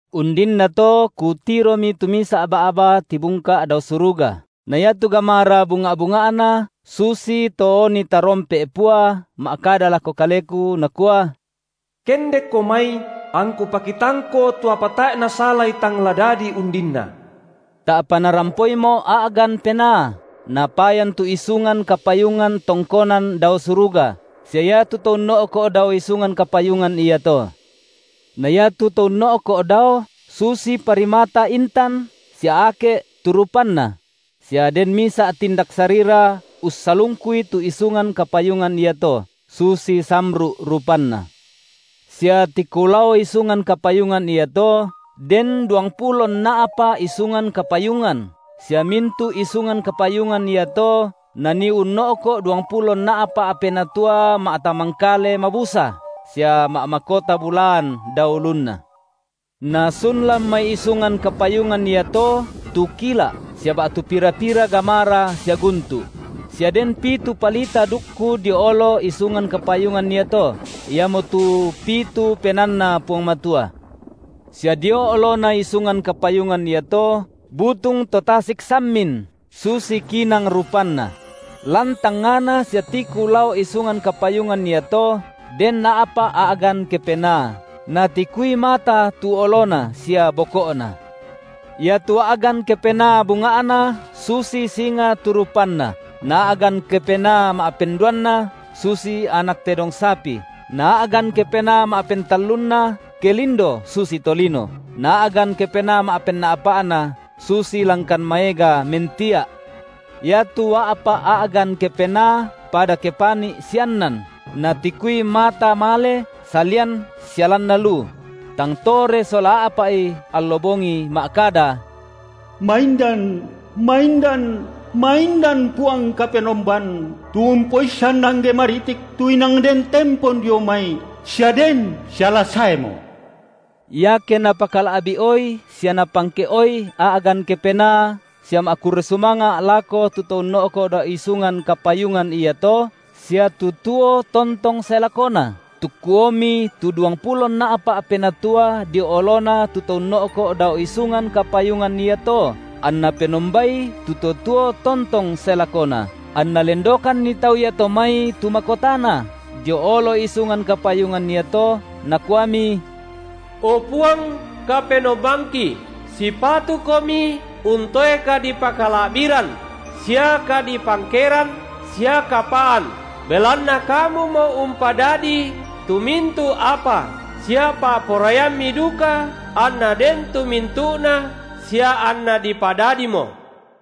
Undinnato kutiromi tu misa’ ba’ba tibungka’ dao suruga, na iatu gamara bunga’-bunga’na susito oni tarompe’ pua ma’kada lako kaleku, Nakua: Kendekko mai, angKu pakitangko tu apa tae’ nasalai tang la dadi undinna. Ta’pa narampoimo’ a’gan Penaa, napayan tu isungan kapayungan tongkonan dao suruga, sia iatu To unno’ko’ dao isungan kapayungan iato. Na iatu To unno’ko’ dao, susi parimata intan sia ake’ tu rupanNa; sia den misa’ tindak sarira ussalungkui tu isungan kapayungan iato, susi samru’ rupanna. Sia tiku lao isungan kapayungan iato den duangpulo nna’pa’ isungan kapayungan sia mintu’ isungan kapayungan iato nanii unno’ko’ duangpulo nna’pa’ penatua ma’tamangkale mabusa sia ma’makota bulaan dao ulunna. Nasun lan mai isungan kapayungan iato tu kila’ sia ba’tu pira-pira gamara sia guntu’; sia den pitu palita dukku dio olo isungan kapayungan iato, iamotu pitu PenaanNa Puang Matua. Sia dio olona isungan kapayungan iato butung to tasik sammin, susi kinang rupanna; lan tangngana sia tiku lao isungan kapayungan iato den a’pa’ a’gan kepenaa, natikui mata tu olona sia boko’na. Iatu a’gan kepenaa bunga’na susi singa tu rupanna, na a’gan kepenaa ma’penduanna susi anak tedong sapi, na a’gan kepenaa ma’pentallunna kelindo susi tolino, na a’gan kepenaa ma’penna’pa’na susi langkan maega mentia’. Iatu a’pa’ a’gan kepenaa pada kepani’ siannan, natikui mata male salian sia lanna lu; tang tore sola a’pa’i allo bongi ma’kada: Maindan, maindan, maindan Puang Kapenomban, tu Umpoissan angge maritik, tu inang Den tempon dio mai, sia Den sia la saemo. Iake napakala’bi’oi sia napangke’oi a’gan kepenaa sia ma’kurre sumanga’ lako tu To unno’ko’ dao isungan, kapayungan iato, sia tu tuo tontong sae lakona, tukkuomi tu duangpulo nna’pa’ penatua dio olona tu To unno’ko’ dao isungan kapayungan iato, anna penombai tu To tuo tontong sae lakona, anna lendokanni tau iato mai tu makotana dio olo isungan kapayungan iato, nakuami: O Puang, Kapenombangki, sipatuKomi untoe kadipakala’biran sia kadipangkeran sia kapaan, belanna Kamumo umpadadii tu mintu’ apa sia pa’poraiamMi duka anna den tu mintu’na sia anna dipadadimo.